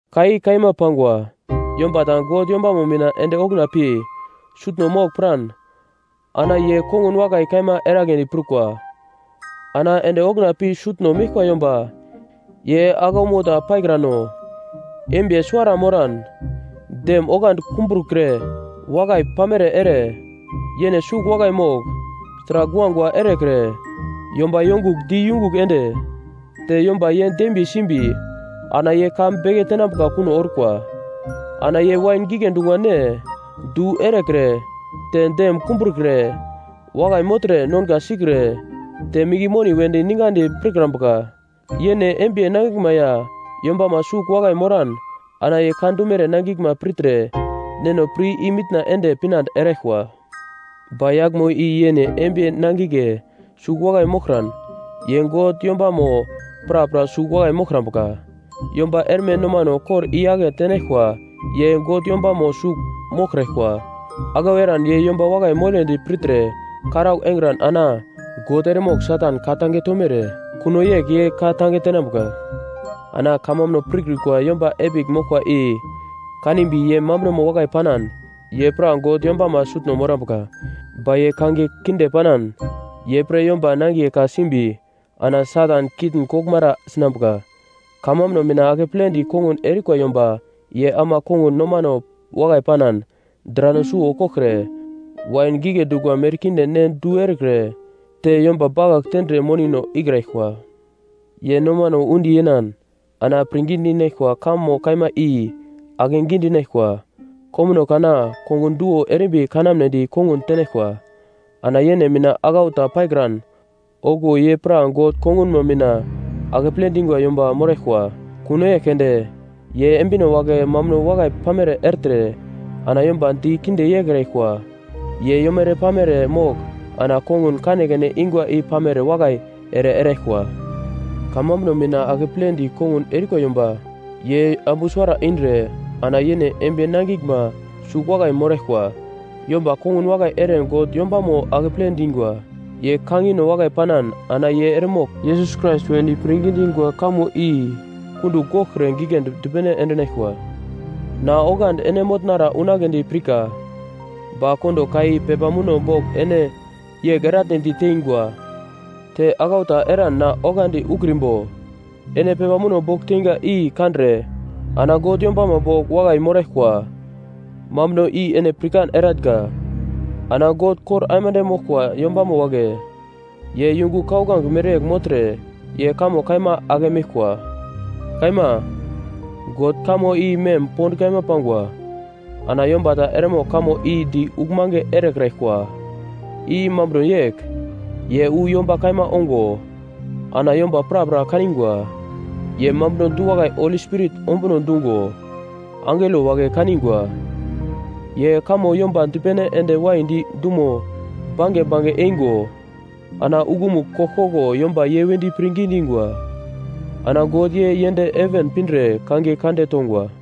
Ka i kaima pangwa. Yomba ta God yombamo mina ende okuna pi sutno mogl piran ana ye kongun wakai kaima eragledi prukwa. Ana ende okuna pi sutno meglkwa yomba ye aglaumo ta paikrano, embiye suwara moran, dem oglandi kumbrokre wakai pamere ere, yene sugl wakai mogl, sragl guagua erekre, yomba yongugl di yungugl ende, te yomba ye dembiye simbi, ana ye ka beke tenambuka kuno orkwa. Ana ye wain gigle dungwa ne du erekre, te dem kumbrukre, wakai mogltre, nonga sikre te minge moni wedi ningadi pirkrambuka. Yene embiye nangiglma ya yombama sugl wakai moran ana ye ka dumere nangiglma pirtre neno pir i-mitna ende pinande eraglkwa. Ba yaglmo i yene embiye nangigle sugl wakai moglkran, ye God yombamo prapra sugl wakai moglkrambuka. Yomba erme nomano kor i-yake tenaglkwa ye God yombamo sugl moglkraglkwa. Aglau eran ye yomba wakai mogledi pirtre karaugl engran ana God eremogl Satan ka-tange tomere kuno yegl ye ka-tange tenambuka. Ana kamambuno pirkrikwa yomba epigl moglkwa i kanimbi ye mambunomo wakai panan, ye pra God yombama sutno morambuka. Ba ye kangiye kinde panan, ye pre yomba nangiye ka simbi ana Satan kitn koglmara sinambuka. Kamambuno mina akepledi kongun erikwa yomba ye ama kongun nomano wakai panan, drano suwo koglkre, wain gigle dungwa merkinde ne du erekre, te yomba bakagl tendre monino ikraglkwa. Ye nomano undi yenan ana pirngi dinaglkwa kamo kaima i ake gidinaglkwa. Komuno kana kongun duwo erimbi kanamnedi kongun tenaglkwa, ana yene mina aglau ta paikran okuwo ye pra God kongunmo mina akeple dingwa yomba moraglkwa. Kuno yegl keunde, ye embino wagle mambuno wakai pamere ertre ana yomba di kinde yeikraglkwa. Ye yomere-pamere mogl ana kongun kanekane ingwa i pamere wakai ere eraglkwa. Kamambuno mina akepledi kongun erikwa yomba ye ambu suwara indre ana yene embiye nangiglma sugl wakai moraglkwa. Yomba kongun wakai ere God yombamo akeple dingwa, ye kangino wakai panan ana ye eremogl Yesus Krais wedi pirngi dingwa kamo i kundugl goglkre giglendi dipene endinaglkwa. Na oglandi ene motnara unagledi pirka, ba kondo ka i pepa muno bogl ene yegl eratnedi teingwa, te aglau ta eran na oglandi ukrimbo, ene pepa muno bogl teinga i kandre ana God yombamo bogl wakai moraglkwa mambuno i ene pirkan eratnga. Ana God kor aimande moglkwa yombamo wagle ye yungu kauglange mereyegl mogltre ye kamo kaima ake meglkwa. Kaima. God kamo i mem pond kaima pangwa, ana yomba ta eremogl kamo i di uglmange erekraglkwa. I mambuno yegl: Ye wu yomba kaima ongo ana yomba prapra kaningwa. Ye mambuno du-wakai Holi Spirit ombuno dungo angelo wagle kaningwa. Ye kamo yomba dipene ende waidi dumo bange bange eingo ana uglomugl koglkoglo yomba ye wedi pirngi dingwa. Ana God ye yend heven pindre kangiye kande tongwa.